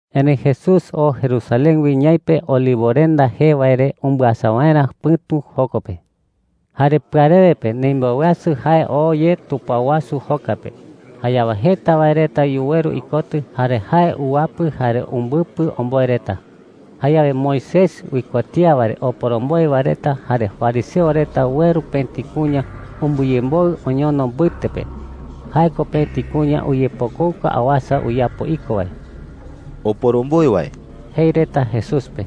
Erëi Jesús oo Jerusalén wi ñaipe Olivorenda jee wae re umbɨasa waerä pɨ̈tu joko pe. Jare pɨarewe pe ndimboweasɨ jae oo ye tupao wasu joka pe. Jayawe jeta wae reta yuweru ikotɨ, jare jae uwapɨ jare umbɨpɨ omboe reta. Jayawe Moisés uikuatía wae re oporomboe wae reta jare fariseo reta ueru pëti kuña umbɨyemboɨ oñono mbɨte pe. Jae ko pëti kuña uyepokouka awasa uyapo iko wae. “Oporomboe wae,” jei reta Jesús pe,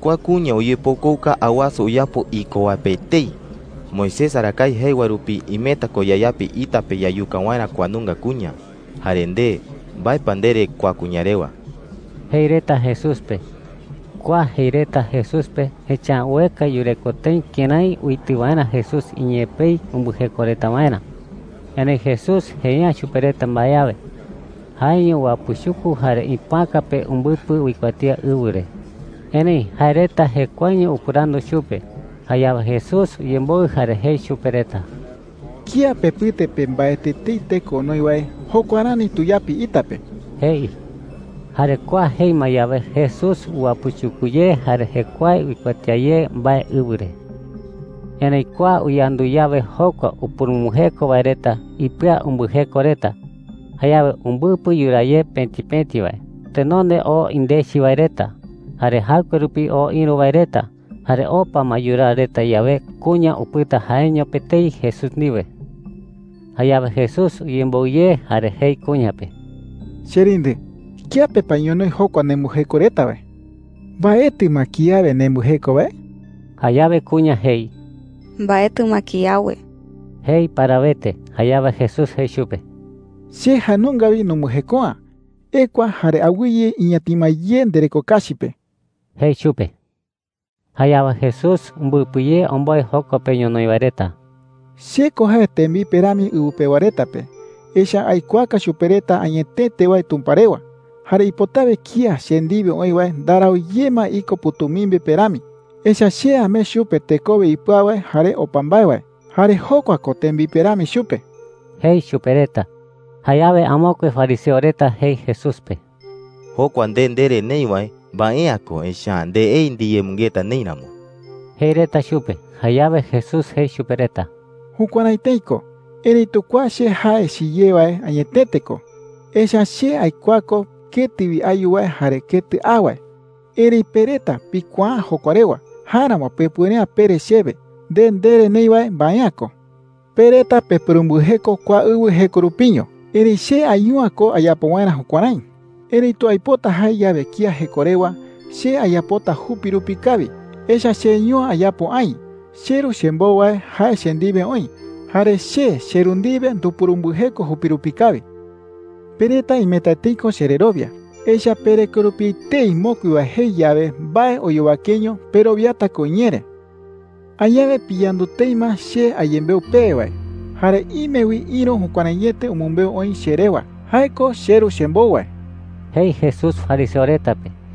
“kua kuña uyepokouka awasa uyapo iko wae pe etei. Moisés arakae jei wae rupi imeta ko yayapi ita pe yayuka waerä kua nunga kuña. Jare nde, ¿mbae pa ndere kua kuña rewa?” jei reta Jesús pe. Kua jei reta Jesús pe, echa’ä ueka yureko tëi kërái uitɨ waerä Jesús iñee pei umbɨjeko reta waerä. Erëi Jesús jei’ä chupe reta mbae awe. Jaeño uwapɨchuku jare ipoäka pe umbɨpɨ uikuatía ɨwɨ re. Erëi jae reta jekuaeño upɨrandu chupe. Jayawe Jesús uyemboɨ jare jei chupe reta: “Kía pepɨte pe mbaetɨ etei teko onoi wae, jokua rani tuyapi ita pe,” jei. Jare kua jei ma yawe, Jesús uwapɨchuku ye jare jekuae uikuatía ye mbae ɨwɨ re. Erëi kua uyandu yawe jokua upurumbɨjeko wae reta, ipɨa umbɨjeko reta. Jayawe umbɨpɨ yuraa ye pëti pëti wae. Tenonde oo indechi wae reta, jare jaɨkue rupi oo ïru wae reta. Jare opa ma yuraa reta yawe, kuña upɨta jaeño pe etei Jesús ndiwe. Jayawe Jesús uyemboɨ ye jare jei kuña pe: “Cherindɨ, ¿kiape pa ñonoï jokua nembɨjeko reta wae?” jei chupe. “¿Mbaetɨ ma kiawe nembɨjeko wae?” Jayawe kuña jei: “Mbaetɨ ma kiawe,” jei parawete. Jayawe Jesús jei chupe: “Che jae nunga wi numbɨjeko’ä. Ekua jare awɨye iñatima ye ndereko kachi pe,” jei chupe. Jayawe Jesús umbɨpɨ ye omboe joko pe ñonoï wae reta: “Che ko jae tembipe rami ɨwɨ pewa reta pe, echa’ä aikuaaka chupe reta añetete wae Tumpa rewa. Jare ipotawe kía che ndiwe oï wae ndarau ye ma iko pɨ̈tumimbi pe rami. Echa’ä che amee chupe tekowe ipɨau wae jare opa mbae wae, jare jokua ko tembipe rami chupe,” jei chupe reta. Jayawe amokue fariseo reta jei Jesús pe: “Jokua nde ndere neï wae, mbae’ä ko, echa’ä ndeei ndiyemɨngeta neï ramo,” jei reta chupe. Jayawe Jesús jei chupe reta: “Jukuärái tëi ko. Erëitu kua che jae chiyé wae añetete ko, echa’ä che aikuaa ko ketɨ wi ayu wae jare ketɨ a wae. Erëi pe reta pikuaa’ä jokua rewa. Jáeramo pepuere’ä pere chewe: ‘Nde ndere neï wae mbae’ä ko.’ Pe reta pepurumbɨjeko kua ɨwɨ jeko rupiño. Erëi che ayu’ä ko ayapo waerä jukuärái. Erëitu aipota jae yawe kía jeko rewa, che ayapota jupi rupi kawi, echa’ä cheiño’ä ayapo aï. CheRu chembou wae jae che ndiwe oï. Jare che cheRu ndiwe ndupurumbɨjeko jupi rupi kawi,” jei chupe reta. “Pe reta imeta tëi ko chererowia, echa’ä pereko rupi etei mokui wae jei yawe mbae oyowakeño, perowiata ko iñee re,” jei chupe reta. “Añawe piyandu tëi ma che ayembeu pewe wae. Jare ime wi ïru jukuäraiete umɨmbeu oï che rewa. Jae ko cheRu chembou wae,” jei Jesús fariseo reta pe.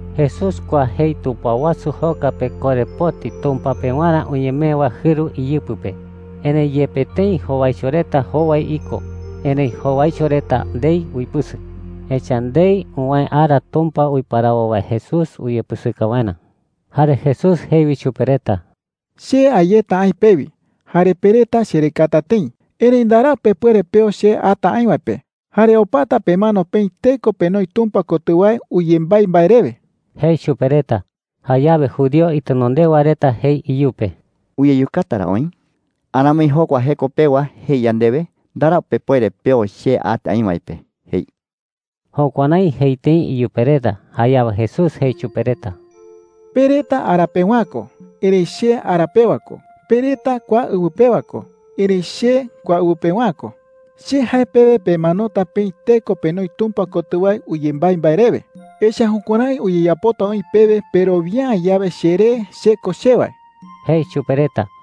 Jesús kua jei tupao wasu joka pe korepoti Tumpa pewarä uñemee wae jɨru iyɨpɨ pe. Erëi yepe tëi jowaicho reta jowai iko, erëi jowaicho reta ndei uipɨsɨ, echa’ä ndei uwäe ara Tumpa uiparawo wae Jesús uyepɨsɨka waerä. Jare Jesús jei wi chupe reta: “Che a yeta aï pewi. Jare pe reta cherekata tëi. Erëi ndarau pepuere peo che ata aï wae pe, jare opata pemano peï teko penoi Tumpa kotɨ wae uyembái mbae rewe,” jei chupe reta. Jayawe judío itenondewa reta jei iyupe: “¿Uyeyukata ra oï? Aramoi jokua jeko pewa jei yandewe, ‘Ndarau pepuere peo che ata aï wae pe,’ jei.” Jukuärái jei tëi iyupe reta. Jayawe Jesús jei chupe reta: “Pe reta ara pewa’ä ko. Erëi che ara pewa ko. Pe reta kua ɨwɨ pewa ko. Erëi che kua ɨwɨ pewa’ä ko. Che jae pewe pemanota peï teko penoi Tumpa kotɨ wae uyembái mbae rewe. Echa’ä jukuärái uyeyapota oï pewe perowia’ä yawe cheré CHE KO CHE wae,” jei chupe reta.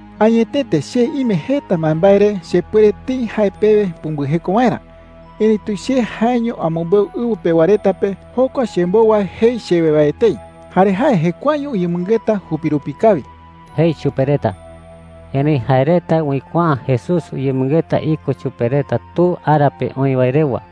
“Añetete che ime jeta mbaembae re chepuere tëi jae pewe pumbɨjeko waerä. Erëitu che jaeño amɨmbeu ɨwɨ pewa reta pe jokua chembou wae jei chewe wae etei. Jare jae jekuaeño uyemɨngeta jupi rupi kawi,” jei chupe reta. Erëi jae reta uikuaa’ä Jesús uyemɨngeta iko chupe reta Tu ara pe oï wae rewa.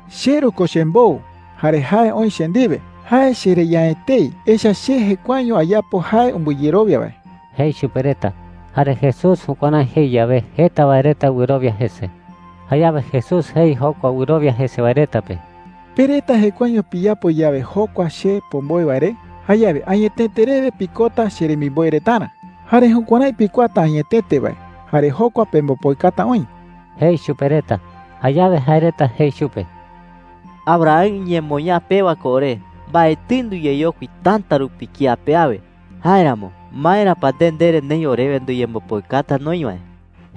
“CheRu ko chembou jare jae oï che ndiwe. Jae chereya’ä etei, echa’ä che jekuaeño ayapo jae umbɨyerowia wae,” jei chupe reta. Jare Jesús jukuärái jei yawe, jeta wae reta wɨrowia jese. Jayawe Jesús jei jokua wɨrowia jese wae reta pe: “Pe reta jekuaeño piyapo yawe jokua che pomboe wae re, jayawe añetete rewe pikota cheremimboe retarä. Jare jukuärái pikuaata añetete wae, jare jokua pembopoikata oï,” jei chupe reta. Jayawe jae reta jei chupe: “Abraham iñemoñaa pewa ko ore. Mbaetɨi nduyeyokui täta rupi kía pe awe. Jáeramo, ¿maera pa nde ndere neï orewe nduyembopoikata noï wae?”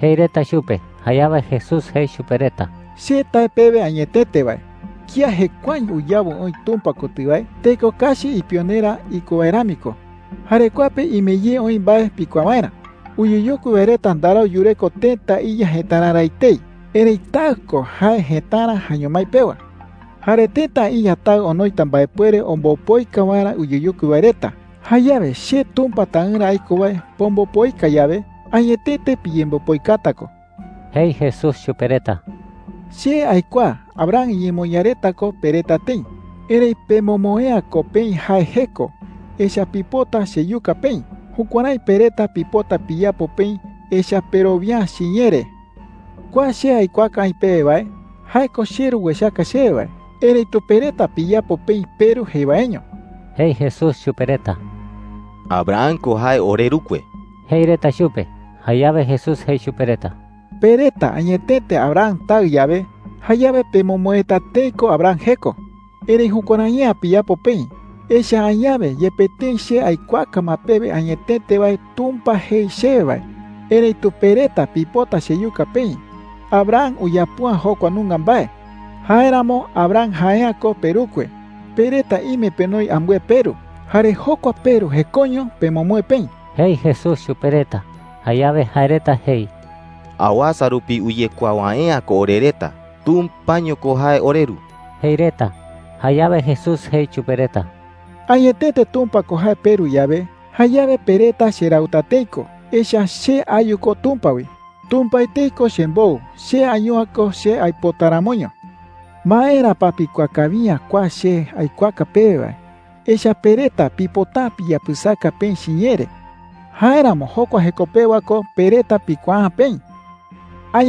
jei reta chupe. Jayawe Jesús jei chupe reta: “Che tae pewe añetete wae, kía jekuaeño uyawɨ oï Tumpa kotɨ wae, teko kachi ipionerä iko wae rami ko,” jei. “Jare kua pe ime ye oï mbae pikuaa waerä. Uyeyokui wae reta ndarau yureko tëta iya jëtararä etei. Erëi taɨ ko jae jëtara jaeño mái pewa,” jei. “Jare tëta iya taɨ onoita mbaepuere ombopoika waerä uyeyokui wae reta. Jayawe che Tumpa Taɨrä aiko wae pombopoika yawe, añetete piyembopoikata ko,” jei Jesús chupe reta. “Che aikuaa Abraham iñemoñaa reta ko pe reta tëi. Erëi pemomoe’ä ko peï jae jeko, echa’ä pipota cheyuka peï. Jukuärái pe reta pipota piyapo peï, echa’ä perowia’ä chiñee re,” jei. “Kua che aikuaaka aï pewe wae, jae ko cheRu uechaka chewe wae. Erëitu pe reta piyapo peï peru jei waeño,” jei Jesús chupe reta. “Abraham ko jae orerukue,” jei reta chupe. Jayawe Jesús jei chupe reta: “Pe reta añetete Abraham taɨ yawe, jayawe pemomoeta tëi ko Abraham jeko. Erëi jukuärai’ä piyapo peï. Echa’ä añawe yepe tëi che aikuaaka ma pewe añetete wae Tumpa jei chewe wae, erëitu pe reta pipota cheyuka peï. Abraham uyapo’ä jokua nunga mbae. Jáeramo Abraham jae’ä ko perukue. Pe reta ime penoi ambɨe peru. Jare jokua peru jekoño pemomoe peï,” jei Jesús chupe reta. Jayawe jae reta jei: “¡Awasa rupi uyekuaa wae’ä ko ore reta! ¡Tumpaño ko jae oreru!” jei reta. Jayawe Jesús jei chupe reta: “Añetete Tumpa ko jae peRu yawe, jayawe pe reta cherauta tëi ko, echa’ä che ayu ko Tumpa wi. Tumpa etei ko chembou. Che ayu’ä ko che aipota ramoño,” jei chupe reta. “¿Maera pa pikuaa kawi’ä kua che aikuaaka pewe wae? Echa’ä pe reta pipota’ä piyapɨsaka peï chiñee re. Jáeramo jokua jeko pewa ko pe reta pikuaa’ä peï,” jei chupe reta.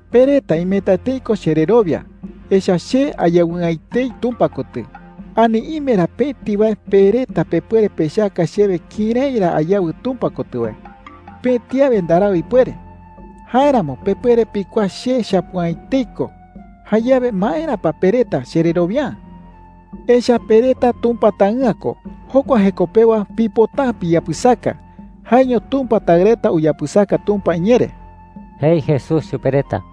Pe reta imeta tëi ko chererowia, echa’ä che ayawɨ'ä etei Tumpa kotɨ. Ani ¿ime ra pëti wae pe reta pepuere pechaka chewe kërái ra ayawɨ Tumpa kotɨ wae? Pëti awe ndarau ipuere. Jáeramo pepuere pikuaa che chapu’ä etei ko. Jayawe, ¿maera pa pe reta chererowia’ä? Echa’ä pe reta Tumpa taɨ'ä ko. Jokua jeko pewa pipota’ä piyapɨsaka. Jaeño Tumpa taɨ reta uyapɨsaka Tumpa iñee re,” jei Jesús chupe reta.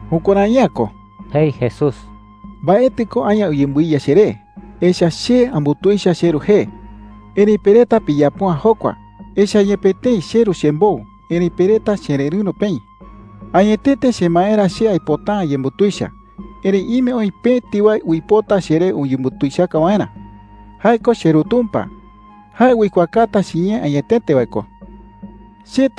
“Jukuärai’ä ko,” jei Jesús. “Mbaetɨ ko aña uyembɨiya cheré, echa’ä che ambutuicha cheRu jee. Erëi pe reta piyapo’ä jokua, echa’ä yepe tëi cheRu chembou, erëi pe reta chererɨ̈ro peï,” jei. “Añetete chemaerä che aipota’ä ayembutuicha. Erëi ime oï pëti wae uipota cheree uyembutuichaka waerä. Jae ko cheRu Tumpa. Jae uikuaakata chiñee añetete wae ko,” jei.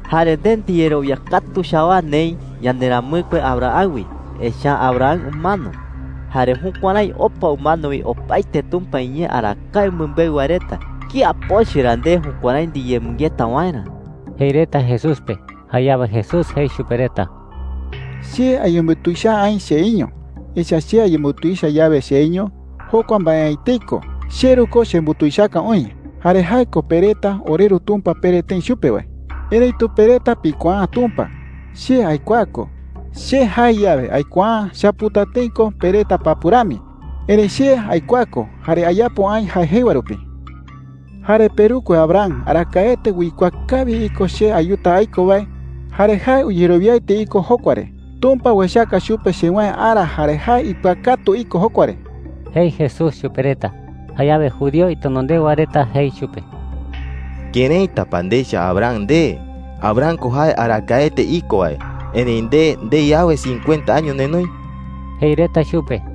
“Jare nde ndiyererowia katu chawaa neï yanderamɨkue Abraham wi, echa’ä Abraham umano. Jare jukuärái opa umano wi opaete Tumpa iñee arakae umɨmbeu wae reta. ¿Kía pochɨ ra nde jukuärái ndiyemɨngeta waerä?” jei reta Jesús pe. Jayawe Jesús jei chupe reta: “Che ayembutuicha’ä aï cheiño. Echa’ä che ayembutuicha yawe cheiño, jokua mbae’ä etei ko. CheRu ko chembutuichaka oï. Jare jae ko pe reta ‘oreRu Tumpa’ pere tëi chupe wae. Erëitu pe reta pikuaa’ä Tumpa. Che aikuaa ko. Che jae yawe, ‘Aikuaa’ä,’ chaputa tëi ko pe reta papu rami. Erëi che aikuaa ko, jare ayapo aï jae jei wae rupi,” jei chupe reta. “Jare perukue Abraham arakaete uikuaa kawi iko che ayuta aiko wae jare jae uyerowiaete iko jokua re. Tumpa uechaka chupe chewäe ara jare jae ipɨakatu iko jokua re,” jei Jesús chupe reta. Jayawe judío itenondewa reta jei chupe: “¿Këraita pa ndecha Abraham nde? Abraham ko jae arakaete iko wae, erëi nde ndei awe cincuenta año nenoi,” jei reta chupe.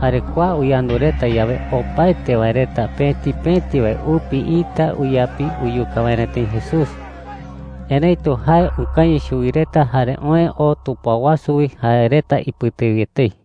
Jare kua uyandu reta yawe, opaete wae reta pëti pëti wae upi ita uyapi uyuka waerä tëi Jesús. Erëitu jae ukañɨ chuwi reta jare oë oo tupao wasu wi jae reta ipɨte wi etei.